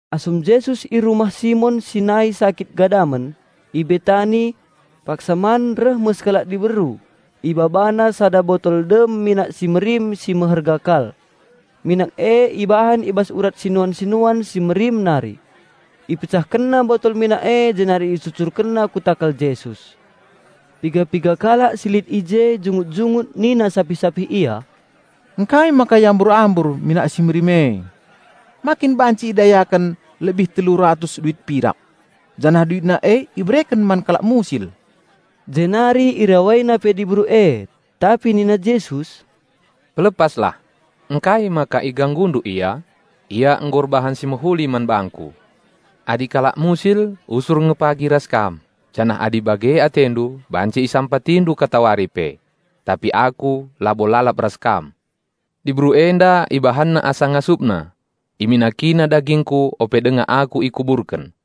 Asum Jesus i rumah Simon si nai sakit gadamen, i Betani, paksa man reh me sekalak diberu, ibabana sada botol dem minak si merim si meherga kal. Minak e ibahan i bas urat sinian-sinuan si merim nari. Ipecahkenna botol minak e jenari icurcurkenna ku takal Jesus. Piga-piga kalak si lit i je jungut-jungut nina sapih-sapih ia, "Ngkai maka iambur-ambur minak si merim e? Ma kin banci idayaken lebih telu ratus duit pirak, janah duitna e ibereken man kalak musil?" Jenari irawaina pe diberu e. Tapi nina Jesus, "Pelepaslah! Ngkai maka iganggundu ia? Ia nggo erbahan si mehuli man bangKu. Adi kalak musil usur nge pagi ras kam janah adi bage atendu banci isampatindu katawari pe. Tapi Aku labo lalap ras kam. Diberu enda ibahanna asa ngasupna. Iminakina dagingKu ope denga Aku ikuburken.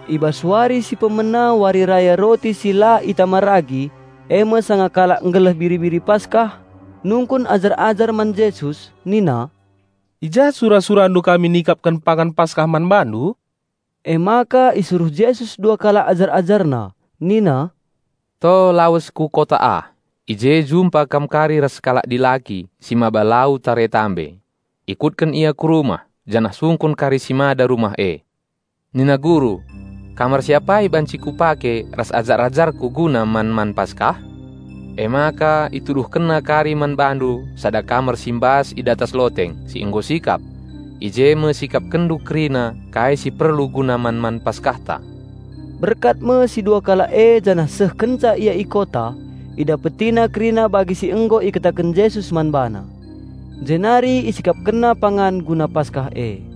I bas wari si pemena wari raya roti si la itama ragi, e me sanga kalak nggeleh biri-biri Paskah, nungkun ajar-ajar man Jesus nina, "Ku ja sura-SuraNdu kami lawes nikapken pangan Paskah man Bandu?" Emaka isuruh Jesus dua kalak ajar-AjarNa nina, "To lawes ku kota ah; i je jumpa kam kari ras sekalak dilaki si maba lau tare guci. Ikutken ia ku rumah, janah sungkun kari si mada rumah e; 'Nina Guru: Kamar si apai banci Kupake ras ajar-ajarKu guna man-man Paskah?' Emaka ituduhkenna kari man bandu sada kamar si mbas i datas loteng, si nggo sikap. I je me sikapkenndu kerina kai si perlu guna man-man Paskahta." Berkat me si dua kalak e janah seh kenca ia i kota, idapetina kerina bagi si nggo ikataken Jesus man bana. Jenari isikapkenna pangan guna Paskah e.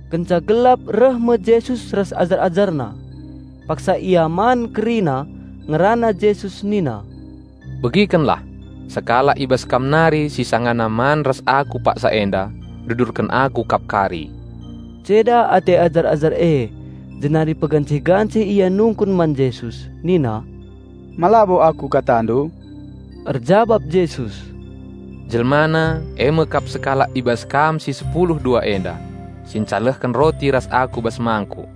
Kenca gelap reh me Jesus ras ajar-AjarNa. Paksa ia man kerina, ngerana Jesus nina, "Begikenlah: sekalak kam si sangana man ras Aku paksa enda, ngendesken Aku kap pagi." Ceda ate ajar-ajar e, janah molai nungkun pegancih-gancih man Jesus nina, "Ma labo aku KataNdu?" Erjabap Jesus, "Jelmana e me kap sekalak i bas kam si sepulu dua enda, e me si sada perpangan ras Aku.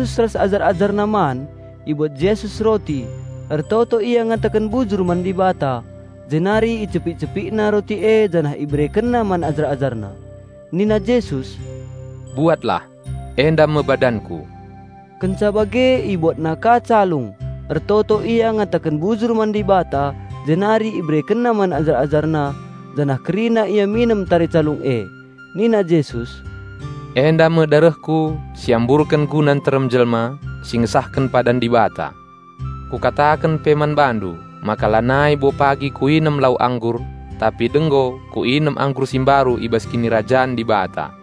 Sanga Jesus ras ajar-AjarNa man, ibuat Jesus roti, ertoto Ia ngataken bujur man Dibata, jenari icepik-CepikNa roti e janah IberekenNa man ajar-AjarNa. Nina Jesus, "Buatlah, enda me badanKu." Kenca bage IbuatNa ka calung, ertoto Ia ngataken bujur man Dibata jenari IberekenNa man ajar-AjarNa, janah kerina ia minem tare calung e. Nina Jesus, "Enda me darehKu si iamburken guna nterem jelma, si ngesahken padan Dibata. Kukataken pe man bandu, maka lanai bo pagi Kuinem lau anggur. Tapi denggo Kuinem anggur si mbaru i bas Kinirajan Dibata."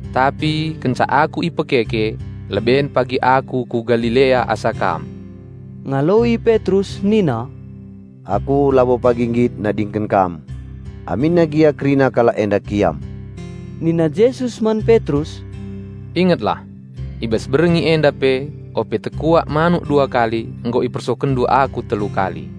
Tapi kenca Aku ipekeke, leben pagi Aku ku Galilea asa kam." Ngaloi Petrus nina, "Aku labo pagi nggit nadingken Kam, aminna gia kerina kalak enda kiam." Nina Jesus man Petrus, "Ingetlah! I bas berngi enda pe, ope tekuak manuk dua kali, nggo ipersokenndu Aku telu kali."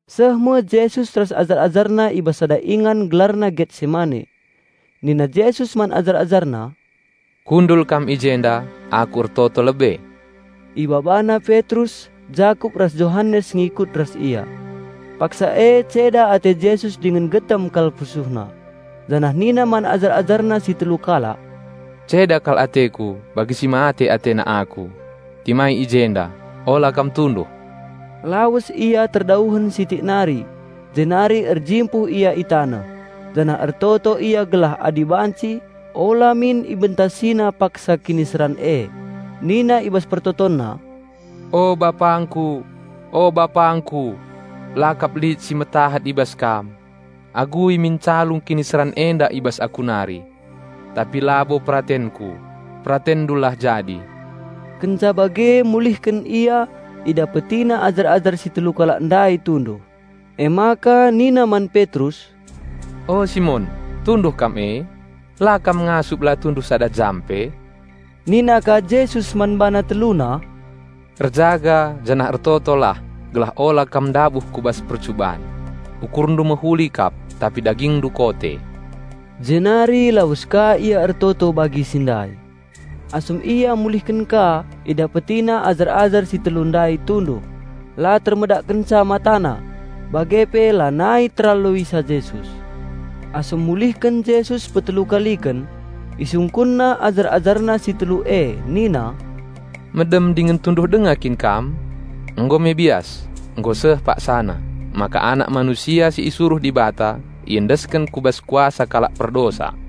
Seh me Jesus ras ajar-AjarNa i bas sada ingan gelarna Getsemane. Nina Jesus man ajar-AjarNa, "Kundul kam i jenda, Aku ertoto lebe." Ibabana Petrus, Jakup ras Johanes ngikut ras Ia. Paksa e ceda ate Jesus dingen getem kal PusuhNa, janah nina man ajar-AjarNa si telu kalak, "Ceda kal ateKu, bagi si mate atena Aku. Timai i jenda, ola kam tunduh." Lawes Ia terdauhen sitik nari, jenari erjimpuh Ia i taneh, janah ertoto Ia gelah adi banci, ola min IbentasiNa paksa kiniseran e. Nina i bas PertotonNa, "O BapangKu, o BapangKu! La kap lit si metahat i bas Kam. Agui min calung kiniseran enda i bas Aku nari. Tapi labo peratenKu, PeratenNdu lah jadi." Kenca bage mulihken Ia, IdapetiNa ajar-ajar si telu kalak ndai tunduh. Emaka nina man Petrus, "O Simon, tunduh kam e? La kam ngasup la tunduh sada jam pe?" Nina ka Jesus man bana teluna, "Erjaga janah ertotolah gelah ola kam ndabuh ku bas percuban. Ukurndu mehuli kap tapi dagingndu kote." Jenari lawes ka Ia ertoto bagi si ndai. Asum Ia mulihken ka, idapetina ajar-ajar si telu ndai tunduh; la termedakkenca matana, bage pe lanai teraloisa Jesus. Asum mulihken Jesus petelu kaliken, IsungkunNa ajar-AjarNa si telu e nina, "Medem dingen tunduh denga kin kam? Nggo me bias! Nggo seh paksana, maka Anak Manusia si isuruh Dibata iendesken ku bas kuasa kalak perdosa.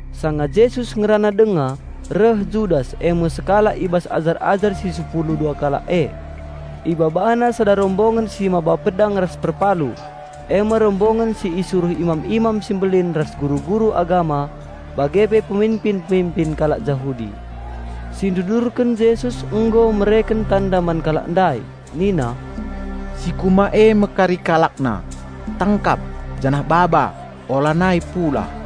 Sanga Jesus ngerana denga, reh Judas, e me sekalak i bas ajar-ajar si sepulu dua kalak e. Ibabana sada rombongen si maba pedang ras perpalu, e me rombongen si isuruh imam-imam si mbelin ras guru-guru agama bage pe peminpin-peminpin kalak Jahudi. Si ndudurken Jesus nggo mereken tanda man kalak ndai, nina, "Si kuema e me kari kalakna, tangkap janah baba, olanai pulah."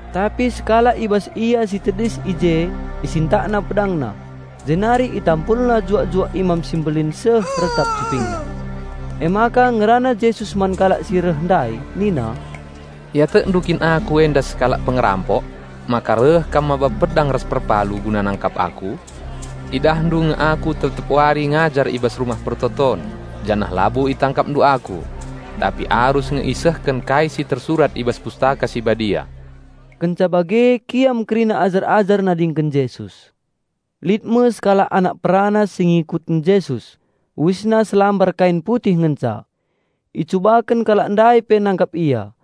Tapi sekalak i bas ia si tedis i je isintakna pedangna, jenari itampulna juak-juak Imam si Mbelin seh retap cupingna. Emaka ngerana Jesus man kalak si reh ndai nina, "Iatekndu kin Aku enda sekalak pengerampok maka reh kam maba pedang ras perpalu guna nangkap Aku? Idahndu nge Aku tep-tep wari ngajar i bas Rumah Pertoton, janah labo itangkapndu Aku. Tapi arus nge isehken kai si tersurat i bas Pustaka Si Badia." Kenca bage kiam kerina ajar-ajar nadingken Jesus. Lit me sekalak anak perana si ngikutken Jesus, uisna selambar kain putih ngenca. Icubaken kalak ndai pe nangkap ia,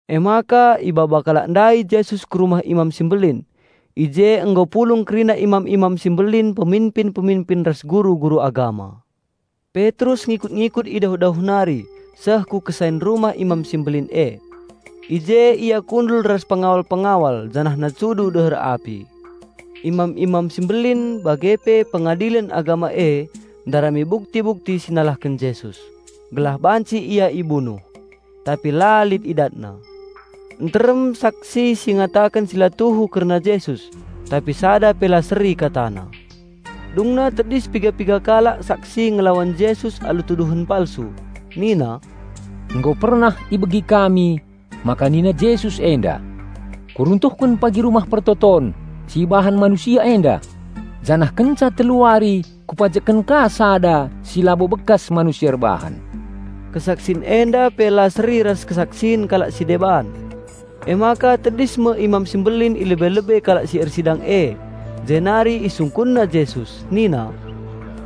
Emaka ibaba kalak ndai Jesus kurumah Imam si Mbelin. I je nggo pulung kerina imam-imam si mbelin, peminpin-peminpin ras guru-guru agama. Petrus ngikut-ngikut i dauh-dauh nari seh ku kesain rumah Imam si Mbelin e. I je ia kundul ras pengawal-pengawal janahna cudu deher api. Imam-imam si mbelin bage pe Pengadilen Agama e ndarami bukti-bukti si nalahken Jesus, gelah banci Ia ibunuh; tapi la lit idatna. Nterem saksi si ngataken si la tuhu kerna Jesus, tapi sada pe la seri katana. Dungna tedis piga-piga kalak saksi ngelawan Jesus alu tuduhen palsu, nina, "Nggo pernah ibegi kami maka nina Jesus enda, 'Kuruntuhken pagi Rumah Pertoton si ibahan manusia enda, janah kenca telu wari Kupajekken ka sada si labo bekas manusia erbahan.'" Kesaksin enda pe la seri ras kesaksin kalak si deban. Emaka tedis me Imam si Mbelin i lebe-lebe kalak si ersidang e jenari isungkunna Jesus nina,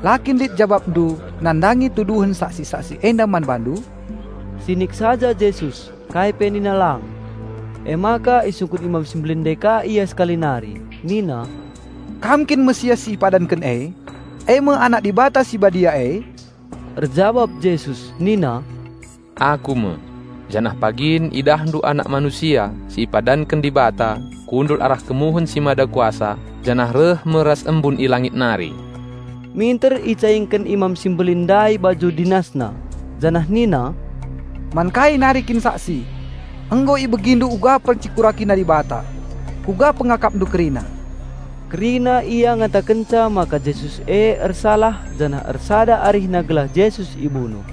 "La kin lit jabapndu nandangi tuduhen saksi-saksi enda man bandu?" Sinik saja Jesus, kai pe nina lang. Emaka isungkun Imam si Mbelin ndai ka Ia sekali nari nina, "Kam kin Raja Penampat si ipadanken e, e me Anak Dibata si Badia e?" Erjabap Jesus nina, "Aku me, janah pagin idahndu Anak Manusia si ipadanken Dibata kundul arah kemuhen si Mada Kuasa janah reh me ras embun i langit nari!" Minter icaingken Imam si Mbelin ndai baju dinasna, janah nina, "Man kai nari kin saksi? Nggo ibegindu uga PencekurakiNa Dibata. Kuga pengakapndu kerina?" Kerina ia ngatakenca maka Jesus e ersalah janah ersada arihna gelah Jesus ibunuh.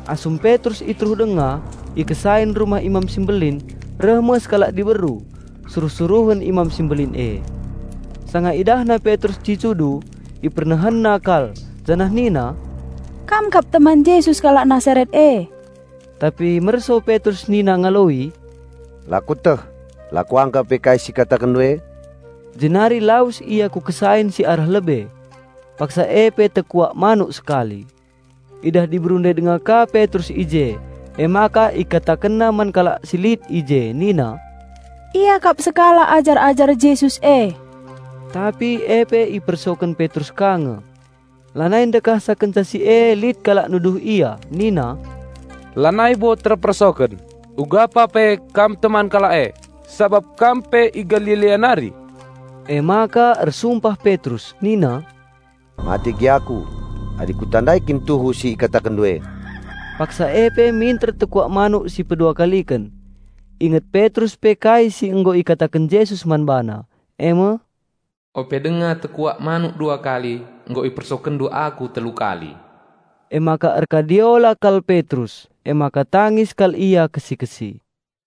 Asum Petrus i teruh denga, i kesain rumah Imam si Mbelin, reh me sekalak diberu, suruh-suruhen Imam si Mbelin e. Sanga idahna Petrus cudu, ipernehenna kal janah nina, "Kam kap salah-sada teman Jesus kalak Nasaret e." Tapi merso Petrus nina ngaloi, "La kueteh... la kuangka pe kai si ikatakenndu e." Jenari lawes ia ku kesain si arah lebe. Paksa e pe tekuak manuk sekali. Idah diberu ndai denga ka Petrus i je, emaka ikatakenna man kalak si lit i je nina, "Ia kap sekalak ajar-ajar Jesus e!" Tapi e pe ipersoken Petrus ka nge. Lanai ndekahsa kenca si e lit kalak nuduh ia nina, "Lanai bo terpersoken; nggo pasti kam salah sada i bas kalak e, sabap kam pe i Galilea nari!" Emaka ersumpah Petrus nina, "Mate gia aku, adi kutandai kin tuhu si ikatakenndu e!" Paksa e pe minter tekuak manuk si pedua kaliken. Inget Petrus pe kai si nggo ikataken Jesus man bana, e me, "Ope denga tekuak manuk dua kali, nggo ipersokenndu Aku telu kali!" Emaka erkadiola kal Petrus emaka tangis kal ia kesi-kesi.